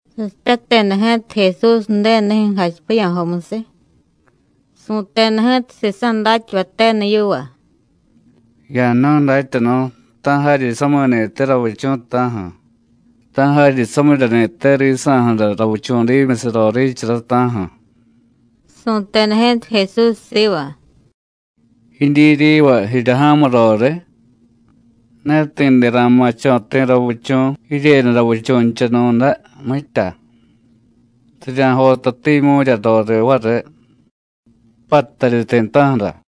Sasipyateda ji̱ta Jesús Ju̱denunijyu̱ jachipiya̱jomusiy, su̱teda ji̱ta sisa̱ datyavay tenu yiva: “Ya̱jnu̱y, Datyanu̱, ¡ta̱ jaryi sami̱ni̱te ravichu̱, ta̱ju̱! ¡ta̱ jaryi samiryani̱te risa̱ju̱ra ravichu̱dimusiy roriichara, ta̱ju̱!” Su̱teda ji̱ta Jesús siva: “¿Jidyi riva jirya ja̱mu roriy? Ne ti̱de ra̱ma̱cho̱ ti̱ ravichu̱ jiryenu ravichu̱nchanu̱day, mitya. Rirya̱jotatimyu̱rya roriy variy, pattaryi ti̱ta̱ju̱ra.”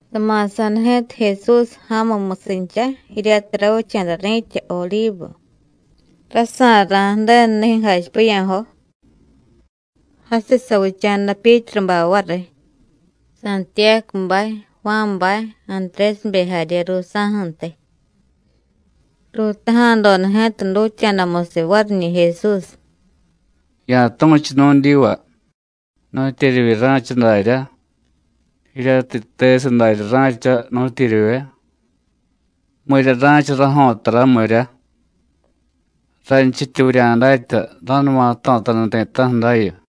Sama̱sa̱da ji̱ta Jesús ja̱mumusincha jiryatiy ravicha̱da ri̱tya Odivu, rasa̱ra̱ Ju̱denunijyu̱ jachipiya̱jo. Jasiy savicha̱da Pyítrubay variy, Santiyácubay, Juánbay, Antrésibe jarye ruusa̱ju̱ntiy. Ruutaja̱doda ji̱ta dutya̱damusiy variñi̱ Jesús: “Ya̱tu̱chu nu̱dyiva: ¿Nu̱tyeryivye ra̱cha daryá, jiryatiy yitesiy darya ra̱cha, nu̱tyeryivye? ¿Mirya ra̱cha rajo̱tara, mirya? ranchityi vurya̱datya: Ra̱numa jto̱taniy ti̱ta̱ju̱ dayu.”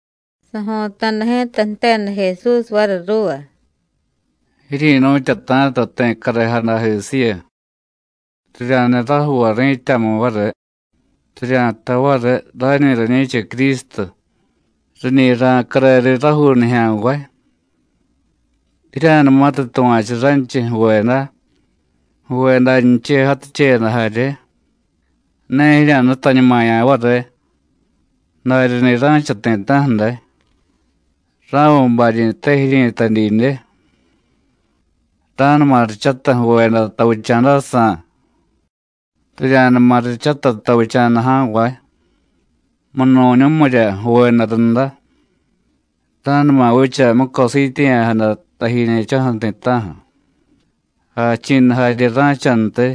Sajo̱ta̱da ji̱ta jteda Jesús variy ruuva: “Jiryi̱nu̱tyata̱ta ti̱ carejadajisiyu. Rirya̱jniy rajuuvay ri̱tyamu variy, rirya̱jtay variy: Rañi rañi̱cha Crístu, riñi ra̱care riy rajuu nijya̱nvay. Jirya̱numatiy tuva̱chu ranchiy ju̱veda, ju̱vedanchiy jaticheyada jarye, ne jirya̱nutañumaya̱ variy, daryani̱ ra̱cha ti̱ta̱ju̱ day. Ra̱viy baryi̱te jiryi̱tay didye. Ra̱numa richatay ju̱veda tavicha̱dajsa̱, rirya̱numa richatay tavicha̱da ja̱nvay munu̱ñumirya ju̱veda runda; ra̱numa vicha mucosiityeya̱jada tajiñe̱cho̱ju̱ ti̱ta̱ju̱, jachi̱nu jarye ra̱chantiy.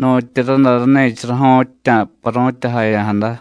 Nu̱tyi raday ráni̱cha rajo̱ttya̱ paru̱tyajaya̱jada.”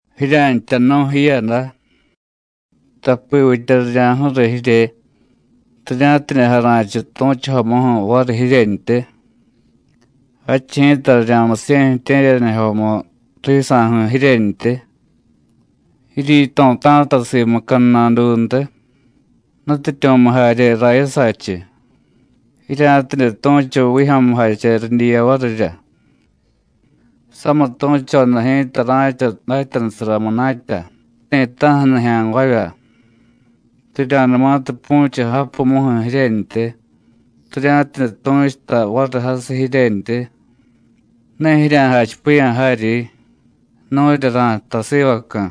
“Jirya̱ntya jnu̱y jiyada, tapivitya rirya̱ju̱riy jirye rirya̱tidye jara̱chiy tu̱chujomuju̱ variy jiryentyi. Jadchiy ji̱ta rirya̱musiye̱ ju̱tye̱ryanijyomu risa̱ju̱ jiryentyi. Jiryíto̱tá̱ta simu cadnaduntiy, nutyityu̱mu jarye rayasachiy, jirya̱tidye tu̱chu vijyo̱mujache ridyiya varirya. Samitu̱choda ji̱ta ra̱cha datyanusara munatya ti̱ta̱ju̱ nijya̱nvavya. Rirya̱numatiy pu̱chiy japumuju̱ jiryentyi, rirya̱tidye tu̱chuta variy jasiy jiryentyi, ne jirya̱jachipiya̱ jaryi: Nu̱rya ra̱jtay sivacu̱.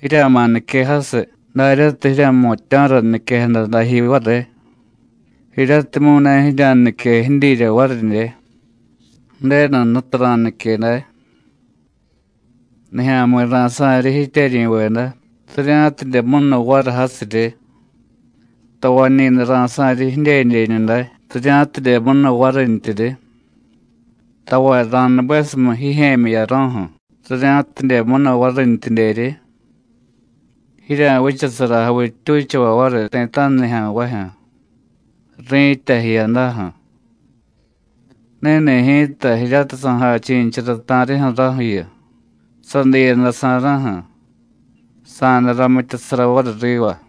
Jirya̱ma̱ nique jasiy, daryatiy jirya̱jmutya̱ra niquejada dajiy variy, jiryatimyu̱ ne jirya̱nique jidyirya varidye, Ju̱denu Jnutu ra̱nique day. Nijya̱mi̱ ra̱sa̱ryi jityeryi̱veda, rirya̱tidye munu variy jasiryi, tavañi̱day ra̱sa̱ryi jidyedyeñu day, rirya̱tidye munu varintyiryi; tavay ra̱nubesumiy jijye̱myi jiyaro̱ju̱, rirya̱tidye munu varintyidyeryi. Jirya̱vichasara javittyuchavay variy ti̱ta̱ju̱ nijya̱nvajyu̱, ri̱tya jiyadaju̱. Ni̱ni̱ ji̱ta jiryatiy sa̱jachi̱nichara ta̱rijyu̱ raju̱yu, sadiiyadasa̱ra̱ju̱, sa̱day ramityasara variy riva.”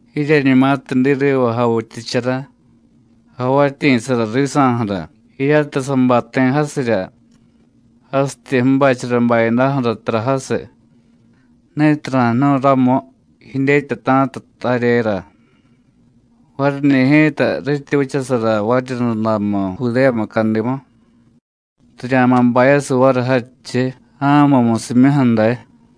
“Jiryeñumatiy diy riva javityichara, javatyi̱sara risa̱ju̱ra, jiryatiy sabay ti̱ jasirya, jasityi ju̱bachara bayadaju̱ra tara jasiy, (ni̱tiy ra̱jnu̱y ramu, jidyetyata̱ta taryera), variñi̱ ji̱ta rityi vichasara variryundamu Judéya mucadimu, rirya̱ma̱ bayasiy variy jadchiy ja̱mumusimyuju̱ day.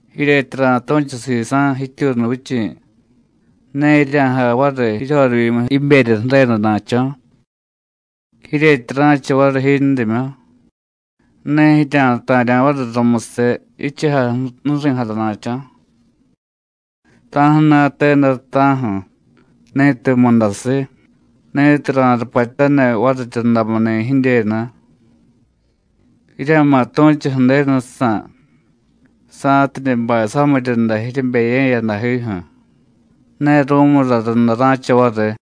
Jiryetyi ra̱tu̱chu sisa̱ jityuunuvichi̱, ne jirya̱jay variy jiryorivyimu jiberya ju̱redana̱cho̱. Jiryetyi ra̱cha variy jindimyu, ne jirya̱ta̱rya̱ variy rumusiy jichujay ju̱ri̱jadana̱cho̱. ¡Ta̱ju̱na̱te day, ta̱ju̱, ni̱tiy mudasiy, ni̱tiy ra̱rupatyaniy variryundamuni̱ jidyenu! Jirya̱ma̱ tu̱chu Ju̱denusa̱, sa̱tidye bay samiryunda jiryebeye̱yadajiju̱, ne ru̱mura runda ra̱cha variy.”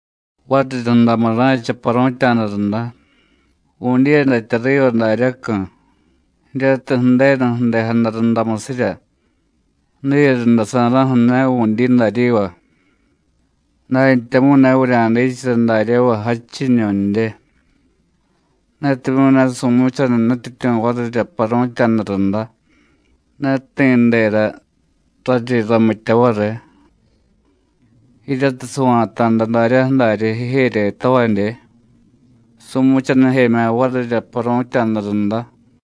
“Variryundamu ra̱cha paru̱tya̱da runda, vu̱dyiyadatya riva daryacu̱, jiryatiy Ju̱denu ju̱dejada rundamusirya, diyerunda sa̱ra̱ju̱ ne vu̱dyi daryiva, dantyamu̱y ne vurya̱dichara daryáva jadchiñu̱ndye. Netimyu̱ ne su̱muchaniy Nutyityu̱ varirya paru̱tya̱da runda, ne ti̱dera raryi ramitya variy. Jiryatiy sava̱ta̱da daryaju̱ daryi jijeryetavadye, su̱muchanijemya̱ varirya paru̱tya̱da runda.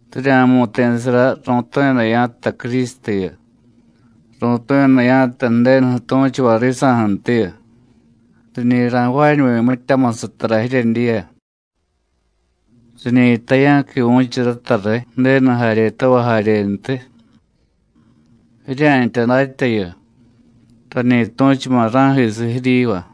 Rirya̱mu̱ti̱sara ru̱tu̱yada ya̱jtay Crístuyu, ru̱tu̱yada ya̱jtay Ju̱denuju̱ tu̱chuvay risa̱ju̱ntiyu. Riñi ra̱jvaañuvi̱ mityamusiy tara jiryedyiya. Riñi jtay ya̱quivu̱chu rata riy Ju̱denu jaryetavay jaryentiy. Jirya̱ntya datyayu, rañi tu̱chuma̱ ra̱jisiy jiryiva.”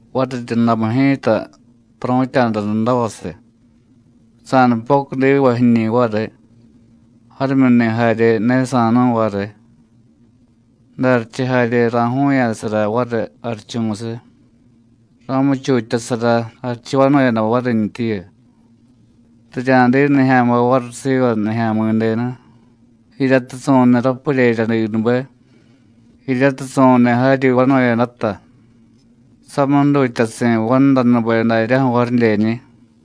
“Variryundamu ji̱ta, paru̱tya̱da rundavasiy, sa̱nupocudivay jiñi̱ variy, jarimyuni̱ jarye ne sa̱nu̱y variy. Jdarichiy jarye ra̱ju̱u̱ya̱sara variy jarichumusiy, ra̱muchutyasara jarichu vanu̱yada varintyiyu. Rirya̱diy nijya̱nvay variy siva Nijya̱mi̱denu, jiryatiy su̱niy rapuryeryadinube, jiryatiy su̱niy jaryi vanu̱yadata, samiy jdutyasi̱ vandanube daryaju̱ varidyeñi̱.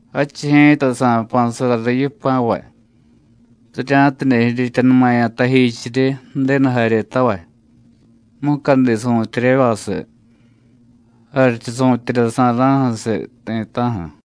Jadchiy ji̱ta sa̱jpa̱sara riy yipa̱vay, rirya̱tidye jirityanumaya̱ tajichiryi Ju̱denu jaryetavay, mucadi su̱tyeryavasiy, jarichu su̱tyerya sa̱ra̱ju̱siy ti̱ta̱ju̱.”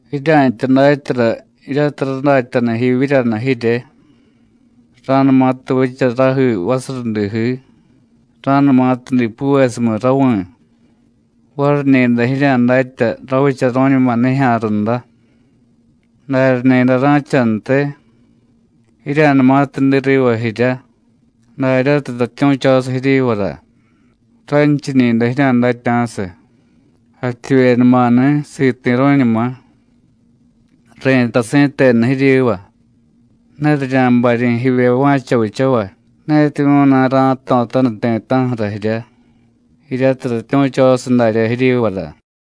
“Jirya̱ntya datyara jiryatiy radatyanu jiivyíryanu jirye. Ra̱numatiy vicha rajii vasurudijii, ra̱numatiy dipuvesumiy ravi̱, variñi̱day jirya̱datya: Ravicharu̱ñuma nijya̱ runda. Darya ni̱day ra̱chantiy, jirya̱numatiy diy riva jiryá, daryatiy ratyu̱chosiy jiryivara, ranchiñi̱day jirya̱datya̱siy: Jativyenumani̱, siti̱ru̱ñuma. Ri̱tay si̱tenu jiryiva: Ne rirya̱baryi̱ jivye va̱cha vichavay, netimyu̱ ne ra̱jto̱taniy ti̱ta̱ju̱ra jirya, jiryatiy ratyu̱chosiy darya jiryivara.”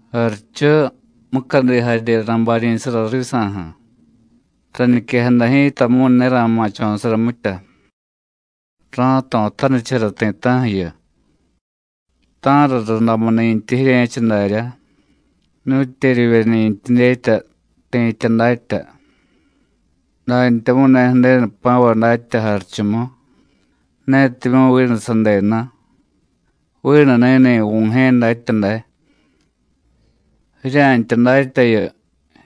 “Jarichu, mucadi jarye ra̱baryi̱sara risa̱ju̱, rañiquejada ji̱tamu̱y ne ra̱ma̱cho̱sara mitya, ra̱jto̱tanichara ti̱ta̱ju̱yu. Ta̱ra rundamuni̱ntyi jirye̱cha darya, nu̱tyeryivyeni̱ntiy dyetya, ti̱tya datya. Dantyamu̱y ne Ju̱denu jpa̱vay datya jarichumu, netimyu̱ vinu sadenu, vinu ni̱ni̱ Vu̱jye̱ datya day. Jirya̱ntya datyayu,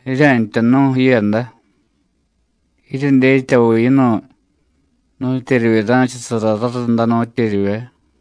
jirya̱ntya jnu̱y jiyada, jiryedyetyaviy yinu̱y nu̱tyeryivye ra̱chasara rarunda, nu̱tyeryivye.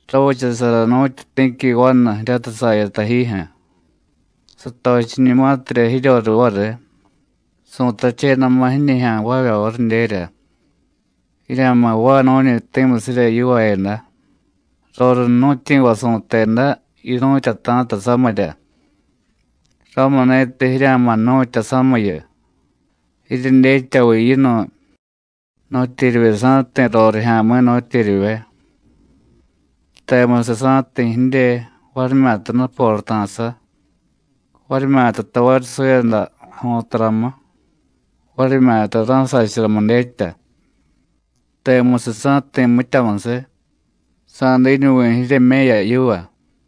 Ravichasara nu̱tyu ti̱qui vanu jiryatiy saya tajijyu̱. Satochiñumatirya jiryoriy variy, su̱tachedama̱ jiñijya̱nvavya varidyerya: Jirya̱ma̱ jvaay nu̱ñi ti̱musirya yivaayada. Roriy jnu̱tyi̱va su̱teda: Yinu̱tyata̱ta samirya. Ramuni̱tiy jirya̱ma̱ jnu̱tya samiyu, jiryedyetyaviy yinu̱y nu̱tyeryivye sa̱jti̱ rorijya̱mi̱, nu̱tyeryivye. Temusiy sa̱jti̱ jidye, varimyata nuporata̱sa, varimyata tavaryi suyada jo̱taramu, varimyata ra̱sacharamu dyetya. Temusiy sa̱jti̱ mityamusiy, sa̱diñuvi̱ jiryeme̱ya yiva.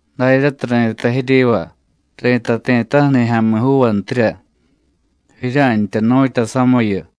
Daryatiy ri̱tay jiryiva, ri̱tay ti̱ta̱ju̱ nijya̱mi̱juuvantiy: Jirya̱ntya jnu̱tya samiyu.”